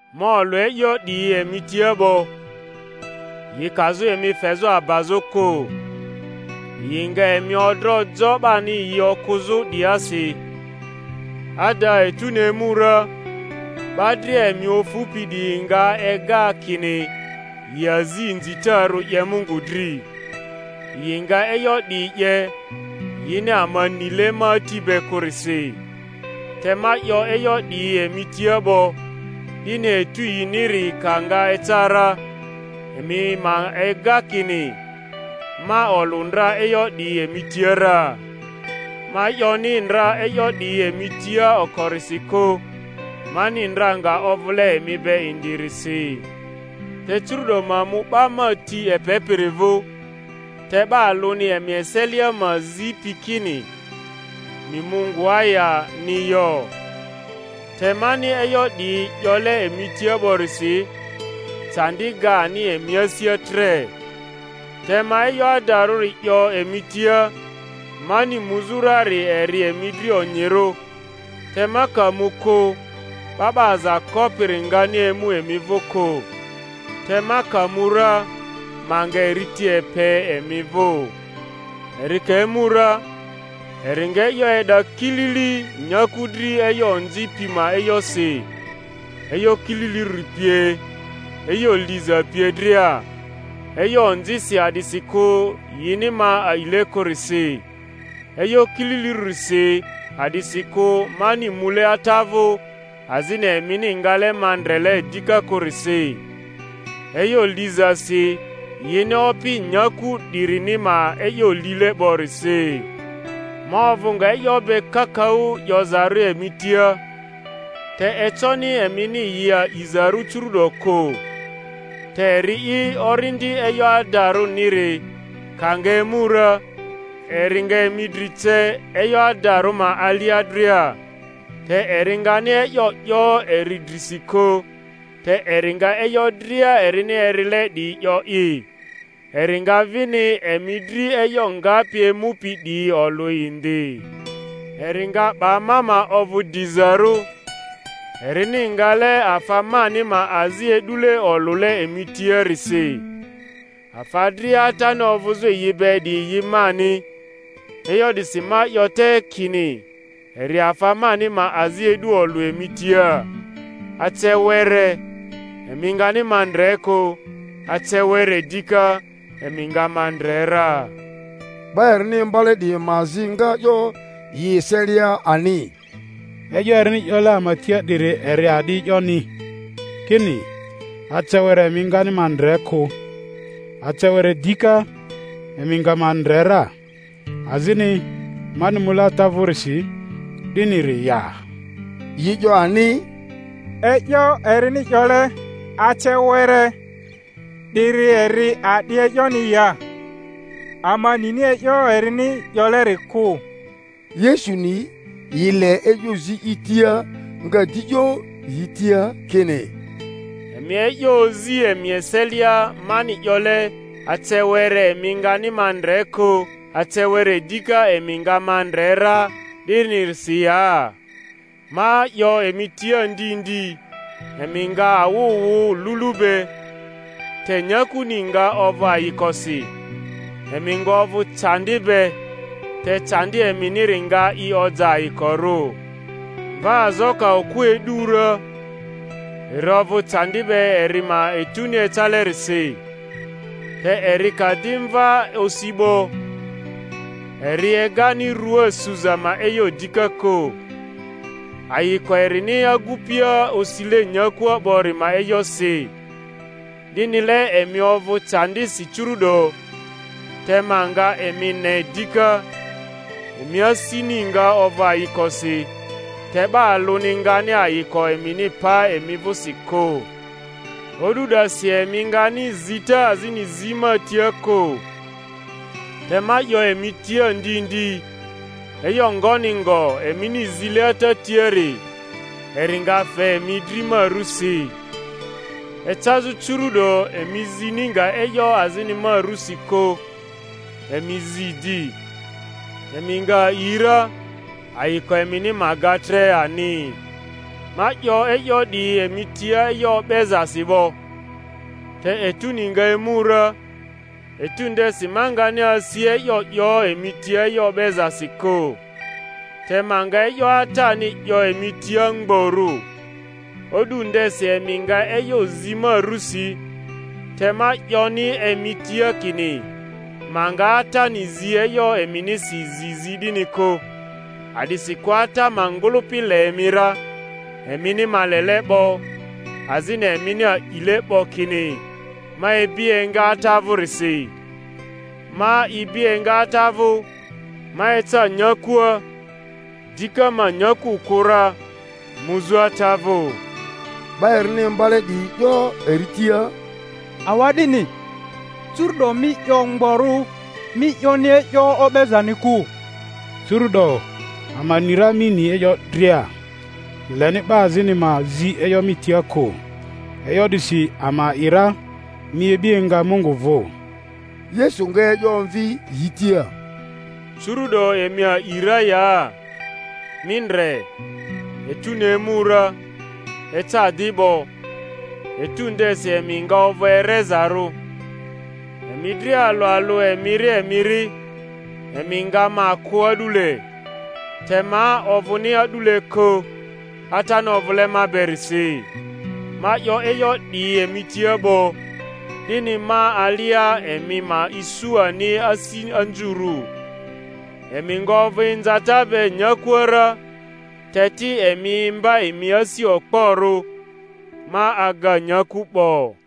Ma olᴜ e'yo 'diyi emi tia 'bo, yi kazᴜ emi fezᴜ abazᴜ kᴜ. Yi nga emi odro jo 'bani yi okᴜzᴜ 'diyiasi; ada etuni emu ra, 'ba dria emi ofupi 'diyi nga ega kini yi azi inzitarᴜ 'ye Mungu dri. Yi nga e'yo 'diyi 'ye, yini ama nile ma Ati be kᴜrisi. Te ma 'yo e'yo 'diyi emi tia 'bo, 'dini etu yiniri ka nga eca ra, emi ma ega kini ma olᴜ ndra e'yo 'diyi emi tia ra. Ma 'yoni ndra e'yo 'diyi emi tia okorisi kᴜ, mani ndra nga ovᴜle emi be indirisi. Te curu'do ma mu 'ba ma ti epepiri vᴜ; te 'ba alᴜni emi eselia ma zipi kini, Mi mu ngoa ya?-ni yo. Te mani e'yo 'diyi 'yole emi tia 'borisi, candi ga ani emi asia tre. Te ma e'yo adarᴜri 'yo emi tia: mani muzᴜ rari eri emi dri onyirᴜ, te ma ka mu kᴜ, 'Ba 'ba Aza Kopiri ngani emu emi vᴜ kᴜ; te ma ka mu ra, ma nga eri ti epe emi vᴜ. Eri ka emu ra, eri nga e'yo e'da kilili nyaku dri e'yo onzi pi ma e'yosi, e'yo kililirᴜri pie, e'yo liza pie dria: e'yo onzisi a'disikᴜ yini ma a'ile kᴜrisi; e'yo kililirᴜrisi a'disikᴜ mani mule Ata vᴜ azini emini ngale ma ndrele dika kᴜrisi; e'yo lizasi yini opi nyaku 'dirini ma e'yo lile 'borisi. Ma ovᴜ nga e'yo be kakaᴜ 'yozarᴜ emi tia, te econi emini yi a'izarᴜ curu'do kᴜ. Te eri'i Orindi e'yo adarᴜniri ka nga emu ra, eri nga emi dri ce e'yo adarᴜ ma alia dria; te eri ngani e'yo 'yo eri drisi kᴜ, te eri nga e'yo dria erini erile 'diyi 'yo'i, eri nga vini emi dri e'yo ngapi emupi 'diyi olᴜ indi. Eri nga 'ba ma ma ovᴜ dizarᴜ, erini ngale afa mani ma azi e'dule olᴜle emi tiarisi. Afa dria Atani ovᴜzᴜ yi be 'diyi yi mani; e'yo 'disi ma 'yo te kini eri afa mani ma azi e'du olᴜ emi tia. Ace were, emi ngani ma ndre kᴜ; ace were dika, emi nga ma ndre ra. 'Ba erini imbale 'diyi ma azi nga 'yo yi eselia ani, E'yo erini 'yole ama tia 'diri eri a'di e'yoni, kini, Ace were emi ngani ma ndre kᴜ, ace were dika, emi nga ma ndre ra; azini, Mani mule Ata vᴜrisi, 'diniri ya? Yi 'yo ani, E'yo erini 'yole, Ace were 'diri eri a'di e'yoni ya? Ama nini e'yo erini 'yoleri kᴜ. Yesu ni yi le e'yo zi i tia, nga di 'yo yi tia kini, Emi e'yo ozi emi eselia mani 'yole, Ace were emi ngani ma ndre kᴜ, ace were dika emi nga ma ndre ra, 'dinirisi ya? Ma 'yo emi tia ndi ndi, emi nga awᴜ wᴜ lulu be, te nyakuni nga ovᴜ ayikosi; emi nga ovᴜ candi be, te candi eminiri nga i oja ayikorᴜ. Mvaazo ka okᴜ e'du ra, eri ovᴜ candi be eri ma etuni ecalerisi; te eri ka di mva osi 'bo, eri egani rua suza ma e'yo dika kᴜ, ayiko erini agupia osile nyakua 'bori ma e'yosi. 'Dinile emi ovᴜ candisi curu'do; te ma nga emi ne dika, emi asini nga ovᴜ ayikosi, te 'ba alᴜni ngani ayiko emini pa emi vᴜsi kᴜ. O'du 'dasi emi ngani zita azini zi ma tia kᴜ. Te ma 'yo emi tia ndi ndi, e'yo ngoni ngo emini zile Ata tiari, eri nga fe emi dri ma rusi. Ecazᴜ curu'do emi zini nga e'yo azini ma rusi kᴜ; emi zi di, emi nga a'i ra, ayiko emini ma ga tre ani. Ma 'yo e'yo 'diyi emi tia e'yo o'bezasi 'bo; te etuni nga emu ra, etu ndesi ma ngani asi e'yo 'yo emi tia e'yo o'bezasi kᴜ, te ma nga e'yo Atani 'yo emi tia mgborᴜ. O'du ndesi emi nga e'yo zi ma rusi; te ma 'yoni emi tia kini ma nga Atani zi e'yo eminisi zi zi 'dini kᴜ; a'disikᴜ Ata ma ngᴜlᴜpi le emi ra, emini ma lele 'bo, azini emini a'ile 'bo kini ma ibi enga Ata vᴜrisi. Ma ibi enga Ata vᴜ, ma eca nyakua; dika ma nyaku kᴜ ra, muzᴜ Ata vᴜ. 'Ba erini imbale 'diyi 'yo eri tia, Awa'dini, curu'do mi 'yo mgborᴜ, mi 'yoni e'yo o'bezani kᴜ! Curu'do ama ni ra mi ni e'yo dria, leni 'ba azini ma zi e'yo mi tia kᴜ; e'yo 'disi ama a'i ra mi ibi enga Mungu vᴜ. Yesu nga e'yo omvi yi tia, Curu’do emi a'i ra ya? Mi ndre, etuni emu ra, eca di 'bo, etu ndesi emi nga ovᴜ erezarᴜ, emi dria alᴜ alᴜ emiri emiri, emi nga ma kᴜ a'dule; te ma ovᴜni a'dule kᴜ, Atani ovᴜle ma berisi. Ma 'yo e'yo 'diyi emi tia 'bo, 'dini ma alia emi ma isu ani asi anzurᴜ. Emi nga ovᴜ inzata be nyakua ra; te ti emi imba emi asi okporᴜ, ma aga nyaku 'bo.